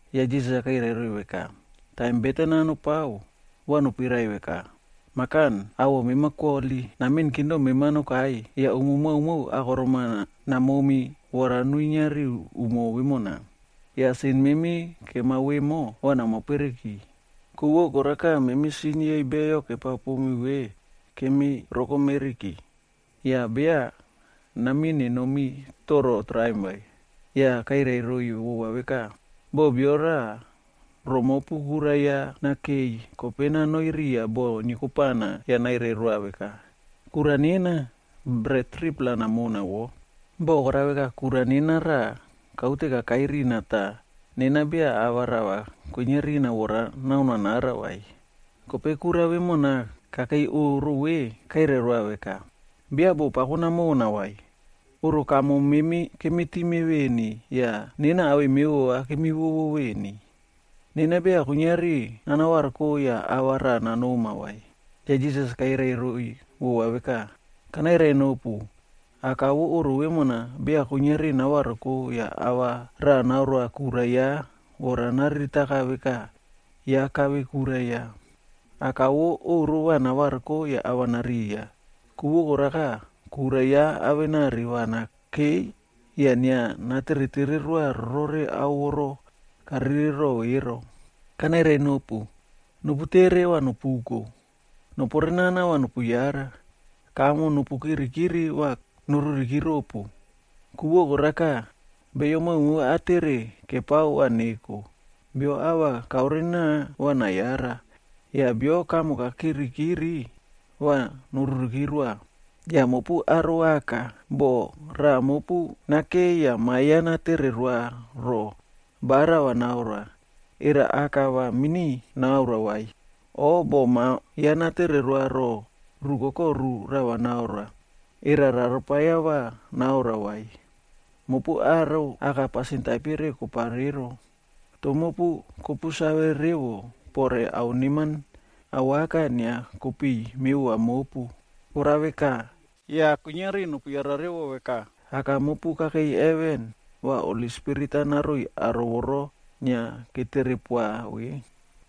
Yah Jisas kairai roiy veka, “Taim beten-a nopao, va nopuirai veka, ‘Mah Kan, awoꞌo mema koholi. Namiꞌin kingdom mema nokai. Yah umo maomao akorom-a namomi vora nuinia riu umo vemona. Yah sin memi kemao vemo, va nama pereki, ku vo koraka memi sin yei beyo kepao pomi ve kemi rokomeriki. Yah beya namin nenomi toro traim vai.’” Yah kairai roiy vova veka, “Boh bia raꞌa romopu kura ya raꞌa nakei, kope nanoi riya bo niekopana yah nairai roa veka, ‘Kura nena, bret 3-pla namona wo. Bo korao veka kura nena raꞌa kaute kakai rina tah nena beya ava rava kwinia rina vora nanoa nara vai.’ “Kope kura vemona kakei oꞌro ve, kairai roa veka, ‘Beya boꞌo pako namona vai, oꞌro kamo memi kemi time veni yah nena awei mevova kemiwowo veni. Nena beya kuiniari nana variko yah ava raꞌa nanoma vai.’” Yah Jisas kairai roiy vova veka, “Kanairai nopu, aka vo oꞌro vemona beya kuiniari navariko yah ava raꞌa naoroa kura ya vora nariritaka veka ya kave kura ya. Aka vo oꞌro va navariko yah ava nariya, ku vo karaka kura ya avenari va nakei yah inia nateretere roa rore ao voro karere rore ero. “Kanairai nopu, nopu tere va nopuko, noporenao va nopu yara, kamo nopu kirikiri va noruriki ropu. Ku vo koraka, beyo maomao atere kepao va neko; bio ava kaore nana, va nayara; yah bio kamo kakirikiri va noruriki roa. “Yah mopu aro aka, boh raꞌa mopu nakei yah ma ya natere roa ro ba rava naoroa, era aka va mini naoroa vai? O boh ma ya natere roa ro rukoko ru rava naoroa, era rarapaia va naoroa vai? Mopu aro aka pasin taipere kopao ero, toh mopu kopu save revo pore ao neman awaka inia kopiꞌiy mevova mopu. Korao veka, yah kuiniari nopu yara revo veka, Aka mopu kakei heven va Holi Spirit-a naroiy aro voro inia ketere poa ve!”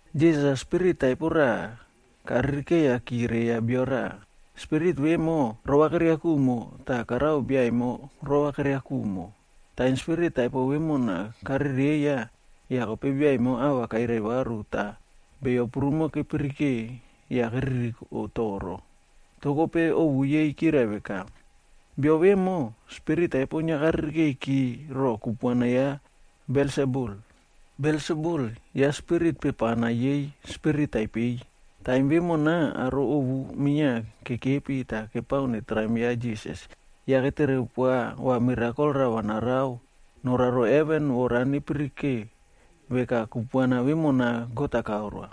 Jisas-a spirit taipo raꞌa karirikeiyaki reiya bio raꞌa. Spirit vemo, rova keria kumo tah karao bia emo rova keria kumo. Taim spirit taipo vemona karereiya, yah kope bia emo ava kairai varu tah beyo prumo kepirike yah keririko toro. Toh kope ovu yei kirai veka, “Bio vemo, spirit taipo inia karirikeiki roꞌo kupuana ya Belsebul.a Belsebul, ya spirit pepana yei spirit taipeiy.” Taim vemona aro ovu minia kekepi tah kepao netraim ya Jisas, yah ketere poa va mirakol rava narao noraro heven vora nepirike veka kupuana vemona God-a kaoroa.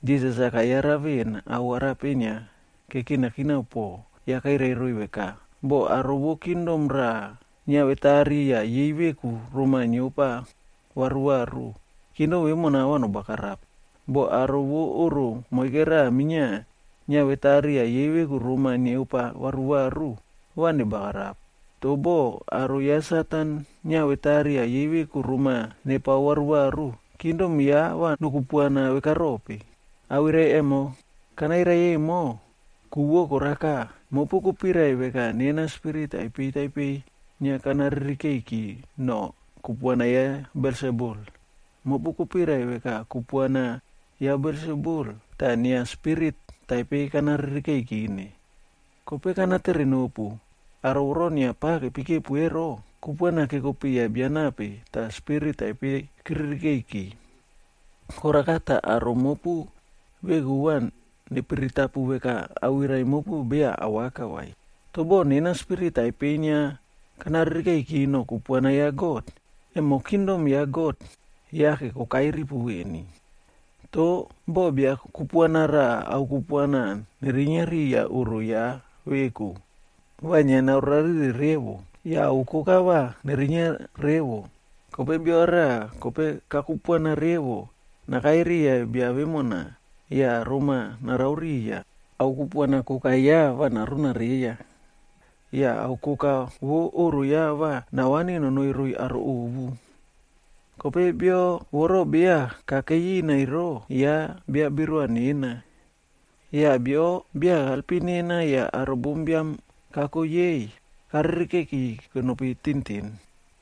Jisas-a kayara ven ao arape inia kekinakina po, yah kairai roiy veka, “Boh aro vo kingdom raꞌa, niavetari yah yei veku roma niopa varuvaru, kingdom vemona va nobagarap. Boh aro vo oꞌro moike raꞌa minia niavetari yah yei veku roma niopa varuvaru, va nebagarap. Toh boh aro ya Satan-a niavetari yah yei veku roma nepao varuvaru, kingdom ya va nokupuana vekarope? Awirai emo kanairai emo, ku vo koraka, mopu kopirai veka nena spirit taipei taipei inia kana ririkeiki no kupuana ya Belsebul. Mopu kopirai veka kupuana ya Belsebul tah inia spirit taipei kana ririkeikine. Kope kana tere nopu, aro voro inia pava kepekepu ero, kupuana keko piya bia nape tah spirit taipei keririkeiki? Koraka tah aro mopu veku va nepiritapu veka awirai mopu beya awaka vai. Toh boh nena spirit taipeiy inia kana ririkeiki no kupuana ya God, emo kingdom ya God yake kokai ripu veni. “Toh, boh bia kupuana raꞌa ao kupuana nerinia riya oꞌro ya veku, va inia naore rarire revo. Yah ao koka ya va nerinia revo. Kope bia raꞌa kope kakupuana revo nakai riya bia vemona yah roma narao riya, ao kupuana koka ya va naruna reiya. Yah ao koka vo oꞌro ya va navani nonoi roiy aro ovu. “Kope bio voro beya kakei ina ero, ya bia birua nena. Yah bio beya kaelpim nena yah aro bombiam-a kako yei, karerekei kenopi tintin.”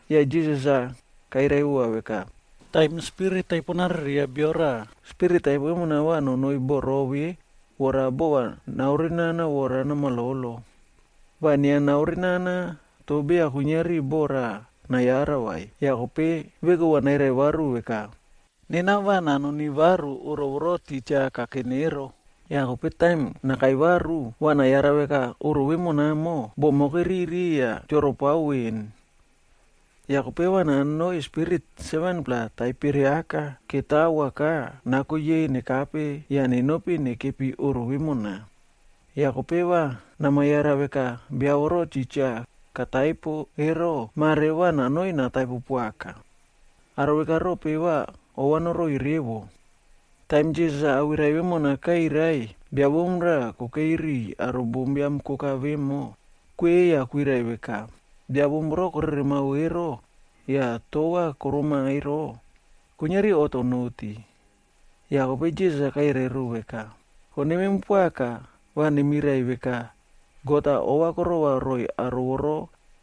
Yah Jisas-a kairai vova veka, “Taim spirit taipo narereiya bio raꞌa, spirit taipo vemona va nanoi bo rove vora bova naorena vora namalolo. Va inia naore nana toh beya kuiniari bo raꞌa nayara vai. Yah kope veku va nairai varu veka, ‘Nena va nanoni varu oꞌro voro titja kanene ero.’ Yah kope taim nakai varu, va nayara veka oꞌro vemonamo, bomo keririki yah choropao ven. Yah kope va nanoi spirit 7-pla taipere aka ketawoka nako yei nekape yah nenopi nekepi oꞌro vemona. Yah kope va nama yara veka bia voro titja kataipo ero, mare va nanoi nataipo poaka.” Aro veka rope va ova noroi revo? Taim Jisas awirai vemona kairai, bia bom raꞌa kokei riꞌiy aro bombiam koka vemo, kweꞌei yah kwirai veka, “Bia bom voro koreremao ero, yah tova koroma ero, kuiniari oꞌto noti.” Yah kope Jisas-a kairai ro veka, “Koneman poaka va nemirai veka, God-a ova korova roiy aro voro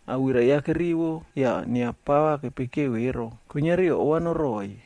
awirai ya kerivo yah inia pava kepikeo ero, kuiniari ova noroꞌoiy.”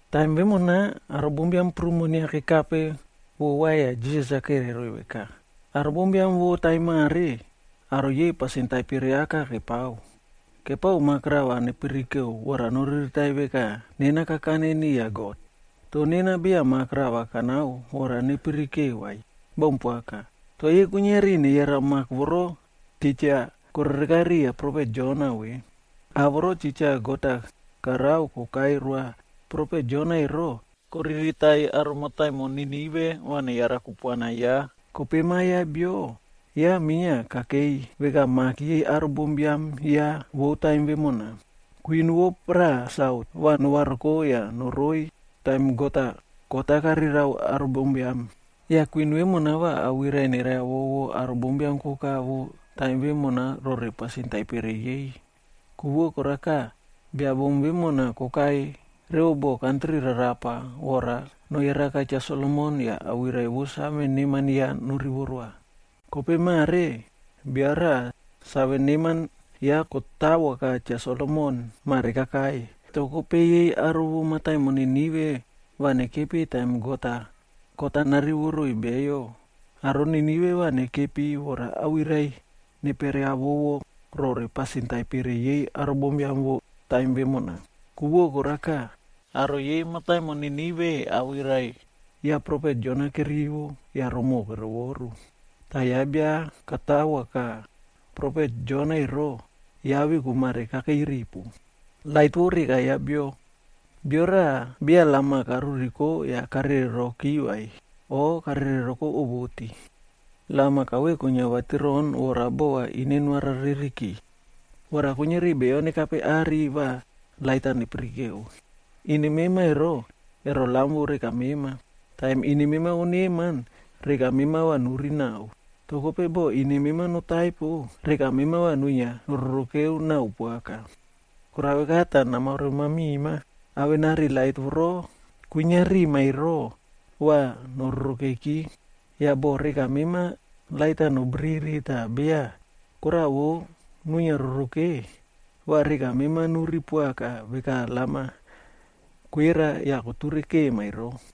Taim vemona, aro bombiam prumo inia kekape vova yah Jisas-a kairai roiy veka, “Aro bombiam vo taim mare, aro yei pasin taipere aka kepao. Kepao mak-a rava nepirike vora noriritaiy veka nena kakane niya God. Toh nena beya mak-a rava kanao vora nepiririke vai. Baun poaka. Toh yei kuiniari neyara mak voro titja korereka riya profet Jonab ve. Ao voro titja God-a karao kokai roa profet Jona ero, koriritaiy aro mataimon Ninive va neyara kupuana ya. Kope Ma Biam ya Bio ya minia kakei veka mak yei aro bombiam ya vou taim vemona. Kwin vo paraꞌa Sautc va novariko yah noroiy taim God-a kot-a narerao aro bombiam. Yah kwin vemona va awirai nereiy avovo aro bombiam koka vo taim vemona rore pasin taipere yei. Ku vo koraka, bia bom vemona kokai revo bo kantri rarapa vora noyaraka Cha Solomon yah awirai vou save neman ya norivo roa. Kope mare bia raꞌa save neman ya katawoka Cha Solomon mare kakai. Toh kope yei aro vo mataimon Ninive va nekepi taim God-a kot-a narivo roiy beyo, aro Ninive va nekepi vora awirai neperiavovo rore pasin taipere yei aro bombiam vo taim vemona. Ku vo koraka, aro yei mataimon Nineve awirai ya profet Jona kerivo yah romoꞌo kerovoru. Tah ya bia katavoka profet Jona ero, ya veku mare kakei ripu. “Bia raꞌa beya lam-a karuriko yah karereroki vai o karereroko owoti. Lam-a kauwe kwinia vatiron vora bova ine noarareriki, vora kuiniari beyo nekape are va lait-a nepirike. Ine mema ero, ero lam vo reka mema. Taim ine mema noneman, reka mema va nuri nao. Toh kope boh ine mema notaipo, reka mema va nuinia nororokeu nao poaka. Korao veka tah namaore mamima, avenari lait voro kwinia rima ero va nororokeki. Yah boh reka mema lait-a nobiriri tah beya koraꞌa vo kwinia roroke, va reka mema nuri poaka veka lam-a kwera yah koture kema ero.”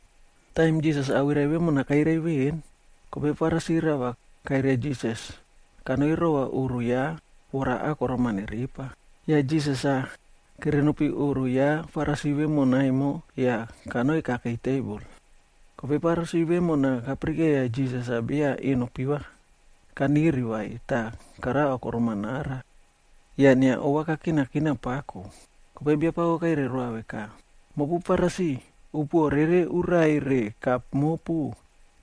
Taim Jisas awirai vemona kairai veꞌen, kope Farisi rava kairia Jisas-a nanoi rova oꞌro ya vora akorom-a nerepa. Yah Jisas-a kere nopi oꞌro ya Farisi vemona emo yah kanoi kakei tebol. Kope Farisi vemona kapirikeiya Jisas-a beya eno piva kaniri vai tah karao akorom-a nara. Yah inia ova kakinakina pako. Kope Biapako kairai roa veka, “Mopu Farisi, upuoꞌo rere urai re kap mopu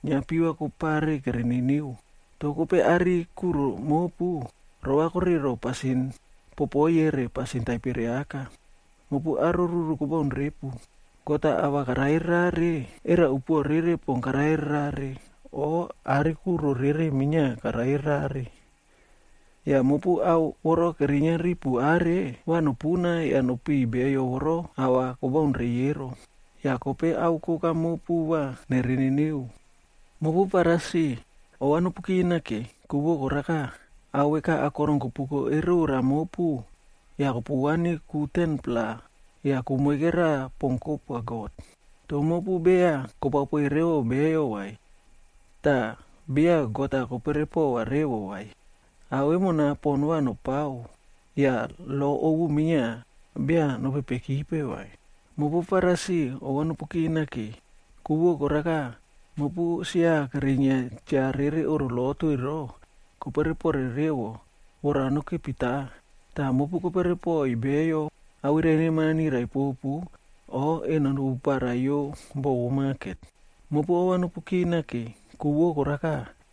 inia piva kopare kere niniu. Toh kope are kuro mopu, rovakore roꞌo pasin popoiye re pasin taipere aka. Mopu aro ruru kobaun repu! God-a ava karare rare, era upuoꞌo rere pon karare rare, o are kuro rere minia karare rare? Yah mopu ao voro kerinia ripu are, va nopuna yah nopiꞌiy beyo voro ava kobaun reiy ero. Yah kope ao koka mopu va nere niniu. “Mopu Farisi, ova nopu kinake! Ku vo koraka, ao veka akorom kopuko erora mopu yah kopuvani ku 10-pla yah ku moike raꞌa pon kopoa God. Toh mopu beya kopao poiy revo beyo vai, tah beya God-a kopere pova revo vai. Ao vemona pon va nopao yah lo ovu minia beya nopepekipe vai. “Mopu Farisi ova nopu kinake! Ku vo koraka mopu sia kerinia cha rere oꞌro lotu ero, kopere pore revo vora nokepita tah mopu kopere poiy beyo awirai neman-a nirai popu o eno nepuparaiyo bo vo maket. “Mopu ova nopu kinake! Ku vo koraka,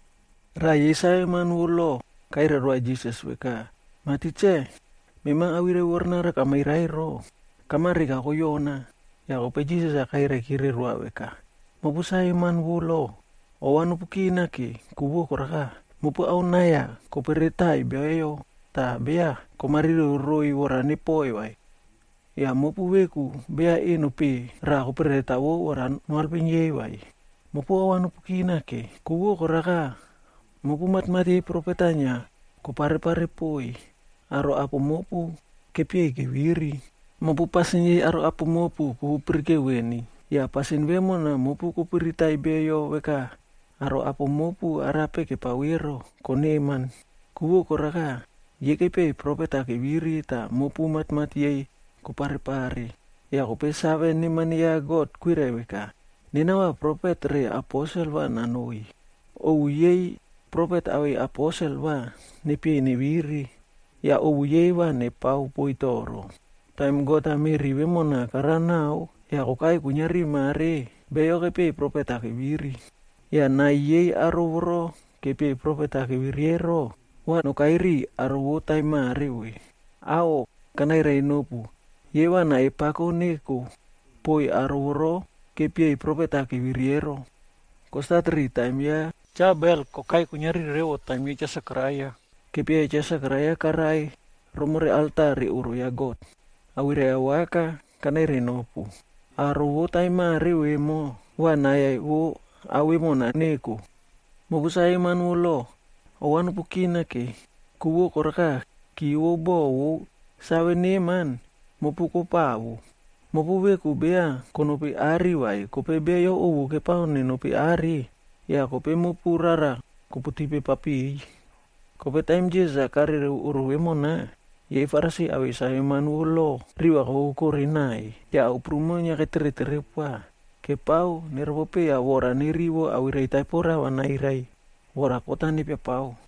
Raꞌa yei saveman vo lo kairai roa Jisas veka, “Mah Tikse, mema awirai voronaro kamairai ero, kama reka va koyomi.” Yah kope Jisas kairaikire roa veka, “Mopu saveman vo lo, ova nopu kinake! Ku vo koraka, mopu ao nai-a koperetaiy beyo tah beya komariro roiy vora nepoiy vai. Yah mopu veku beya eno peꞌe raꞌa koperetawo vora noalpim yei vai. “Mopu ova nopu kinake! Ku vo koraka mopu matmat yei profet-a inia koparepare poiy, aro apo mopu kepieiy keviri. Mopu pasin yei aro apo mopu kopu pirikeu veni. Yah pasin vemona mopu kopiritaiy beyo veka aro apo mopu arape kepao ero, koneman. Ku vo koraka, yei kepieiy profet-a keviri tah mopu matmat yei koparepare. Yah kope save neman ya God kwirai veka, ‘Nena va profet re aposel va nanoiy. Ovu yei profet awei aposel va nepieiy neviri, yah ovu yei va nepao poiy toro.’ Taim God-a meꞌri vemona karao nao yah kokai kuiniari mare, beyo kepieiy profet-a keviri. Yah nai yei aro voro kepieiy profet-a keviri ero, va nokai riꞌiy aro vo taim mare ve. Aꞌho, kanairai nopu yei va nai pako neko poꞌoiy aro voro kepieiy profet-a keviri ero, kostat ri taim ya Cha Abel kokai kuiniari revo taim ya Cha Sekaraia. Kepieiya Cha Sekaraia karai romore alta re oꞌro ya God. Awirai awaka, kanairai nopu, aro vo taim mare ve va nai vo ao vemona va neko. “Mopu saveman vo lo, ova nopu kinake! Ku vo koraka ki vou bo vou save neman, mopu kopawo. Mopu veku beya konopi are vai kope beyo ovu kepao nenopi are yah kope mopu rara koputipe papiꞌiy.” Kope taim Jisas-a karereo oꞌro vemona, yei Farisi awei saveman vou lo riva kokokore naiy, yah ao prumo inia ketere tere poa, kepao neropopeiya vora nerivo awirai taipo rava nairai vora kot-a nepiapao.